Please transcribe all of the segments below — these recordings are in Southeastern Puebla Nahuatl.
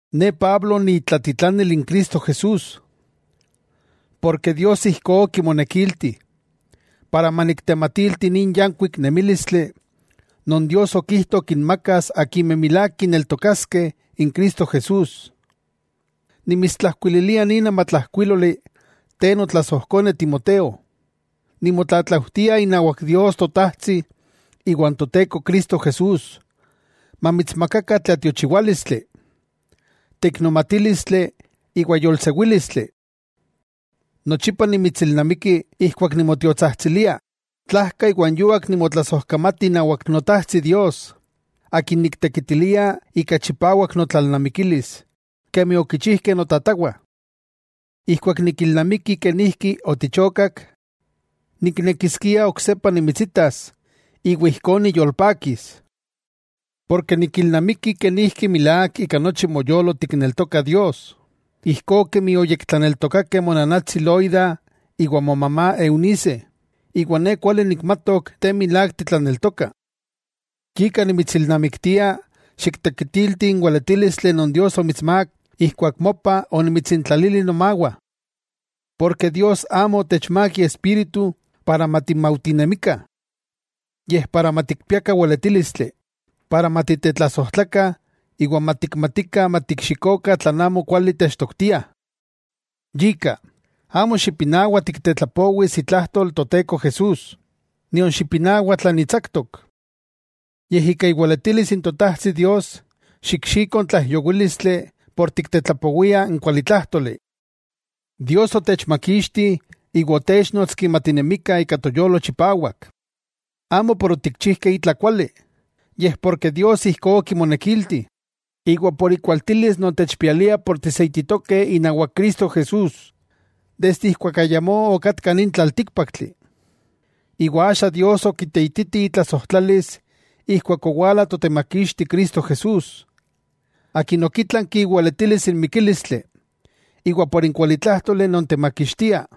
Ne Pablo ni itlatitlanil n Cristo Jesús, Dios ijkó okimonekilti maniktematilti nin yankuik nemílistli non Dios okijto kinmakas akimeh milák kineltokaskeh n Cristo Jesús. Nimitstlajkuililia nin amatlajkuíloli te notlasojkone Timoteo, nimotlatlaujtia inawak Dios Totajtsi iwan Toteko Cristo Jesús mamitsmakakah tlatiochiwálistli, teiknomatílistli iwa yolsewílistli. Nochipa nimitsilnamiki ijkuak nimotiotsajtsilia, tlajka iwa n yuak nimotlasojkamati inawak Notajtsi Dios Akin niktekitilia ika chipawak notlalnamikilis kemi okichijkeh notatawah. Ijkuak nikilnamiki kenijki otichokak, niknekiskia oksepa nimitsitas iwa ijkó niyolpakis. Porke nikilnamiki kenijki milák ika nochi moyolo tikneltoka Dios, ijkó kemi oyektlaneltokakeh monanatsi Loida iwa mona Eunice, iwa ne kuali nikmatok te milák titlaneltoka. Yika nimitsilnamiktia xiktekitilti n weletílistli non Dios omitsmák ijkuak mopa onimitsintlalili nomawah. Dios amo otechmák Iespíritu para matimaujtinemikah, yej para matikpiakah weletílistli, matitetlasojtlakah iwa matikmatikah matikxikokah tlan amo kuali techtoktiah. Yika, amo xipinawa tiktetlapowis itlajtol Toteko Jesús, nion xipinawa tla nitsaktok. Yej ika iweletilis n Totajtsi Dios xikxiko n tlaijyowílistli por tiktetlapowia n kualitlájtoli. Dios otechmakixti iwa otéchnotski matinemikah ika toyolo chipawak. Amo por otikchijkeh itla kuali, yej porke Dios ijkó okimonekilti, iwa por ikualtilis non techpialia ken tiseititokeh inawak Cristo Jesús, desde ijkuak ayamó okatka nin tlaltíkpaktli. Iwa axa Dios okiteititi itlasojtlalis ijkuak owala Totemakixti Cristo Jesús, Akin okitlanki iweletilis n mikílistli, iwa por n kualitlájtoli non temakixtia,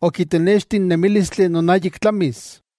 okitenexti n nemílistli non ayik tlamis.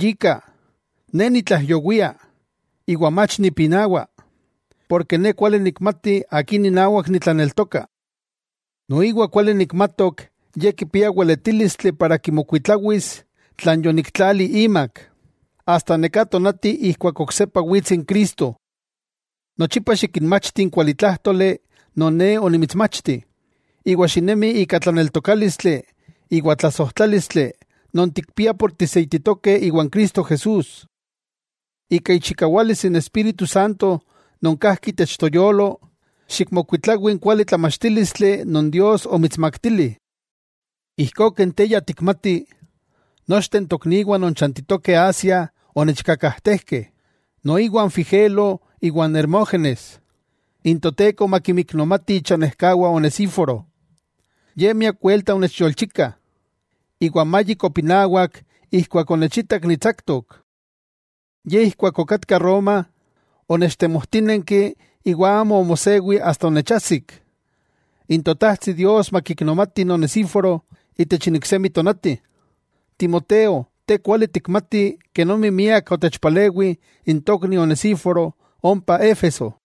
Yika, ne nitlaijyowia, iwa mach nipinawa, ne kuali nikmati akin inawak nitlaneltoka. Noiwa kuali nikmatok Ye kipia weletílistli para kimokuitlawis tlan yoniktlali imak, asta neká tonati ijkuak oksepa wits Cristo. Nochipa xikinmachti n kualitlájtoli non ne onimitsmachti, iwa xinemi ika tlaneltokálistli iwa tlasojtlálistli non tikpiah por tiseititokeh iwan Cristo Jesús. Ika ichikawalis n Espíritu Santo non kajki itech toyolo, xikmokuitlawi n kuali tlamachtílistli non Dios omitsmaktili. Ijkó ken te ya tikmati, nochteh n tokniwah non chantitokeh Asia onechkakajtejkeh, noiwa n Figelo iwa n Hermógenes. N Toteko makinmiknomati ichanejkawah Onesíforo, ye miak welta onechyolchika, iwa amayik opinawak ijkuak onechitak nitsaktok. Yej ijkuak okatka Roma, onechtemojtínenki, iwa amo omosewi asta onechajsik. N Totajtsi Dios makiknomati n Onesíforo itech iksemi tonati. Timoteo te kuali tikmati kenomi miak otechpalewih n tokni Onesíforo ompa Éfeso.